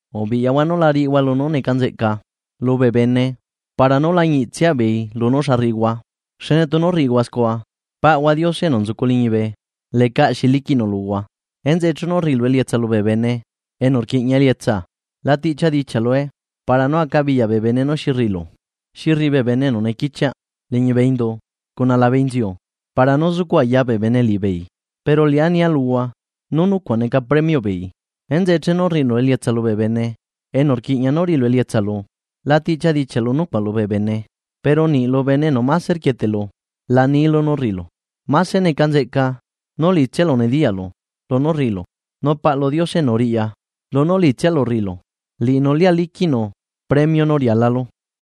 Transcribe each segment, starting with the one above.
’Ubiꞌyahua nu la riꞌihua lunú neca nzeꞌca lubee bene para nú lañiꞌtsia beei lunú xa rriꞌihua. Xne tunu rriꞌihua scua, paꞌhua Diose enu nzucu liñibe lecaꞌ xi liquiꞌnu luhua. Enzeꞌe chenu rriꞌilu elietsa lubee bene enu rquiꞌña elietsa, la tiꞌchia dichiaꞌlue para nú acabiyaꞌ bee bene nú xi rriꞌilu, xi rriꞌi bee bene enu nequichiaꞌ liñibee indu cuna labe inziu para nú zucuꞌ aya bee bene liꞌibeei, pero liꞌá nia luhua nú nucuaꞌ neca premioꞌ beei. Enzeꞌe chenu rriꞌilu elietsa lubee bene enu rquiꞌña nú riꞌilu elietsa lu, la tiꞌchia dichiaꞌlu nucuaꞌ lubee bene, pero niꞌ lu bene enu máse rquieteꞌlu la nilu nú rriꞌilu. Mase neca nzeꞌca nú liꞌitsialu nediyaꞌlu lunú rriꞌilu, nu Paꞌlu Diose enu riꞌya lunú liꞌitsialu rriꞌilu, liꞌinu liá liquiꞌnu premio nú rialalu.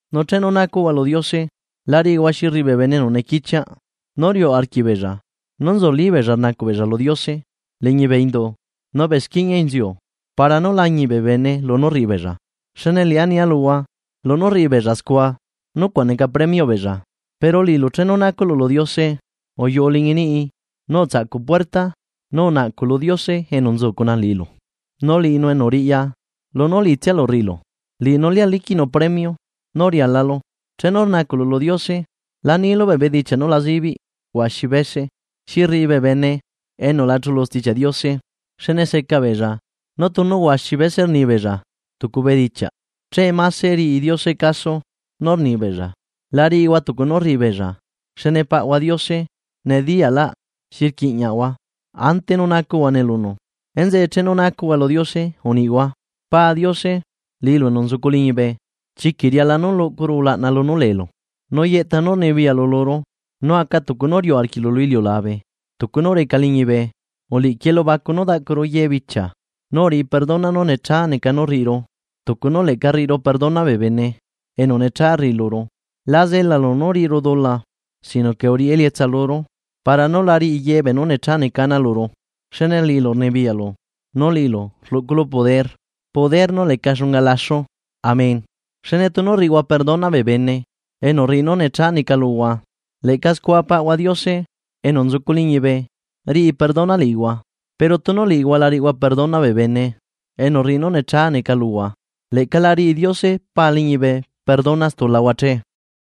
’Nu chenu nacuꞌhua lu Diose, la riꞌihua xi rriꞌi bee bene enu nequichiaꞌ, nú riuꞌ arquiꞌbeella nú nzulí beella rnacuꞌ beella lu Diose liñi bee indu, nu bee squiñia inziu para nú lañiꞌ bee bene lunú rriꞌi beella. Xne liꞌá nia luhua lunú rriꞌi beella scua nucuaꞌ neca premioꞌ beella. Pero liꞌilu chenu nacuꞌlu lu Diose, uyuꞌu liñi niꞌi, nu utsaꞌcu puerta nu unaꞌcuꞌ lu Diose enu nzu cuna liꞌilu. Nu liꞌinu enu riꞌya lunú liꞌitsialu rriꞌilu, liꞌinu lia liquiꞌnu premio nú rialalu. ’Chenu rnacuꞌlu lu Diose, la nilu bee bedichiaꞌ nú la zibiꞌ huaxi bese, xi rriꞌi bee bene enu la chulu Stichiaꞌ Diose. Xne seca beella nú tunu huaxi bese rni beella tucu bedichiaꞌ che máse riꞌi caso Diose nú rni beella. La riꞌihua tucu nú rriꞌi beella, xne paꞌhua Diose nediyaꞌlaꞌ xi rquiꞌñahua ante nú nacuꞌhuane lunu. Enzeꞌe chenu nacuꞌhua lu Diose uniꞌhua: Pa Diose liꞌilu enu nzucu liñibe, Chiquiꞌ riala nú luꞌcuru ulaꞌna lunú leelu. Nu yeꞌta nú rnibiyaꞌlu luru. Nu aca tucu nú riuꞌ arquiꞌlu lu iliulabe, tucu nú reca liñibe. Uliꞌquiꞌ elubacu nú daꞌcuru yebichia. Nu uriꞌi perdona nú necha rriꞌiru tucu nú leꞌca rriꞌiru perdona bee bene enu necha rriꞌi luru. La zelalu nú riꞌiru dula, sino que uriꞌi elietsa luru para nú la riꞌi ye beenú necha neca ana luru. Xne liꞌilu rnibiyaꞌlu, nu liꞌilu rluꞌculu poder, poder nú leca xunga laxu. Amén. ’Xne tunu rriꞌihua perdona bee bene enu rriꞌi nú necha neca luhua, leꞌca scua Paꞌahua Diose enu nzucu liñibe riꞌi perdona liꞌihua; pero tunu liꞌihua la riꞌihua perdona bee bene enu rriꞌi nú necha neca luhua, leꞌca la riꞌi Diose Pa liñibe perdona stulahua che.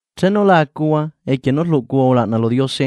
’Chenu la acuhua equie nú rluꞌcuhua ulaꞌna lu Diose,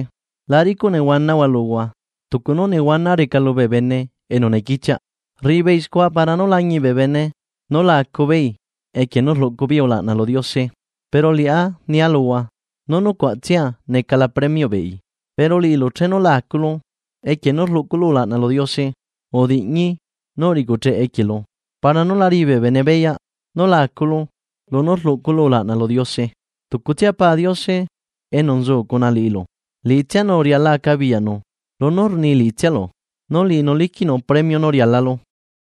la ricuꞌ nehuanahua luhua tucu nú nehuana reca lubee bene enu nequichiaꞌ, rriꞌi beei scua para nú lañiꞌ bee bene nú la acu beei equie nú rluꞌcu beei ulaꞌna lu Diose. Pero liꞌá nia luhua nú nucuaꞌtsia necala premioꞌ beei. Pero liꞌilu, chenu la aculu equie nú rluꞌculu ulaꞌna lu Diose, udiꞌñi nu uriꞌcucheꞌ equielu, para nú la riꞌi bee bene beyaꞌ nú la aculu lunú rluꞌculu ulaꞌna lu Diose. Tucutsia Pa Diose enu nzu cuna liꞌilu liꞌitsianu riala acabiyaꞌnu lunú rni liꞌitsialu, nu liꞌinu liquiꞌnu premio nú rialalu.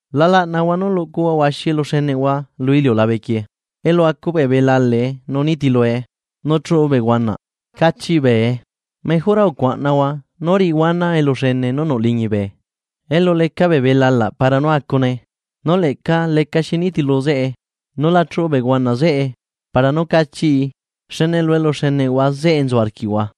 ’La laꞌnahua nú luꞌcuhua huaxi eluxeneꞌhua lu iliulabe quieꞌ, elu acu bee belalaꞌe nu nitilue, nu chuꞌu bee huanaꞌ cachiꞌ bee. Mejora ucuaꞌnahua nú riꞌihua ana eluxene nú nuꞌ liñibe, elu leca bee belalaꞌ para nú acune, nu leꞌca lecaxi nitilu zeꞌe nu la chuꞌu bee huanaꞌ zeꞌe para nú cachiꞌi. Xne lu eluxeneꞌhua zeꞌe nzu arquiꞌhua.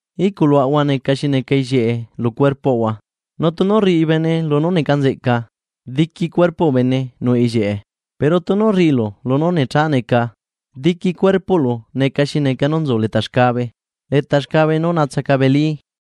’Iꞌculuaꞌahua neca xi neca ellieꞌe lu cuerpoꞌahua, nu tunu rriꞌi bene lunú neca nzeꞌca, diqui cuerpoꞌ bene nuꞌ ellieꞌe, pero tunu rriꞌilu lunú necha neca, diqui cuerpoꞌlu neca xi neca nú nzu leta xcabe, ¡Leta xcabe nú naatsacabelí!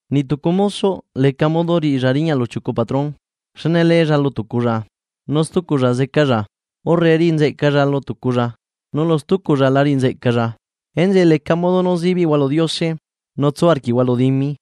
’Niꞌ tucu mosoꞌ leca modo riꞌi riñaꞌ lu chiucu patrón, xne leei lu tuculla, nu stuculla zecai, urre riꞌi nzeꞌcai lu tuculla, nu lu stuculla la riꞌi nzeꞌcai. Enzeꞌe leca modo nú zibiꞌhua lu Diose nu tsu arquiꞌhua lu dimi.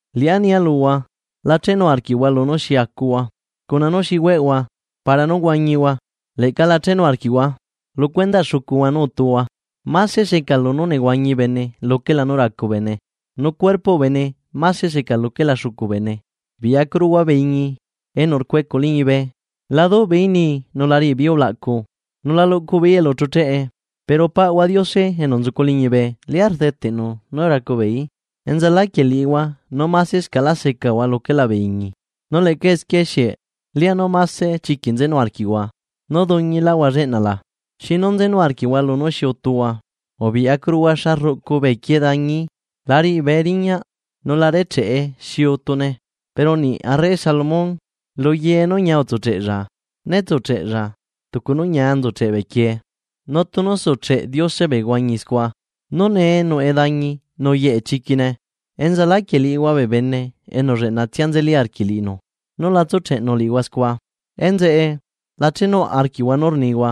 ’Liꞌá nia luhua: La chenu arquiꞌhua lunú xi acuhua cuna nú xi hueꞌhua para nú huañihua. Leꞌca la chenu arquiꞌhua lu cuendaꞌ xucuhua nú utuhua. Máse seca lunú nehuañi bene luquela nú racu bene, nu cuerpoꞌ bene máse seca luquela xucu bene. Biꞌyacuruhua bee iñi enu rcuecuꞌ liñibe. La duꞌ beeí nii nula riꞌi beeí ulaꞌcu, nu la luꞌcu beeí elu chucheꞌe, pero Paꞌahua Diose enu nzucu liñibe lia rdeteꞌnu nú racu beeí. ¿Enzaláquieꞌ liꞌihua nú másescaꞌlá secahua luquela bee iñi? Nu leꞌca esquie, ¿xieꞌ lianú máse chiquiꞌ nzenu arquiꞌhua nú duñilahua lleꞌna la? ’¿Xinu nzenu arquiꞌhua lunú xi utuhua? Ubiꞌyacuruhua xa rruꞌcu bee quie dañi, la riꞌi bee riñaꞌ nu la recheꞌe xi utune, pero niꞌ arre Salomón luye nú ñia utsucheꞌlla, né tsucheꞌlla tucu nú ñia nzucheꞌ bee quie. Nu tunu sucheꞌe Diose bee huañi scua, nú nee nuꞌe dañi nu yeꞌe chiquine. ¡Enzaláquieꞌ liꞌihua bee bene enu lleꞌnatsia nzeli arquiꞌ liꞌinu, nú la tsucheꞌnu liꞌihua scua! Enzeꞌe, la chenuaꞌ arquiꞌhua nú rnihua: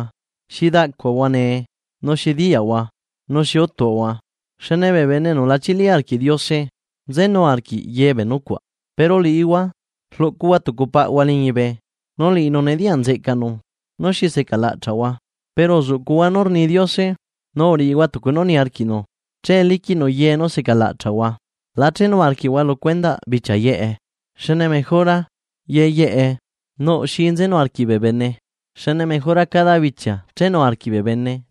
“¿Xi daꞌcuahua nee? nu ¿xi diyaꞌahua? nu ¿xi utuꞌahua?” Xne bee bene enu la chili arquiꞌ Diose nzenu arquiꞌ ye bee nucuaꞌ, pero liꞌihua rluꞌcuhua tucu paꞌhua liñibe, nu liꞌinu nediyaꞌ nzeꞌcanu nú xi seca laꞌchaꞌhua. Pero uzuꞌcuꞌhua nú rni Diose nu uriꞌihua tucu nú niarquiꞌnu che liquiꞌnu ye nú seca laꞌchaꞌhua. La chenu arquiꞌhua lu cuendaꞌ bichia yeꞌe, xne ye yeꞌe nuꞌ xi nzenu arquiꞌ bee bene. Xne cada bichia nuꞌ xi chenu arquiꞌ bene.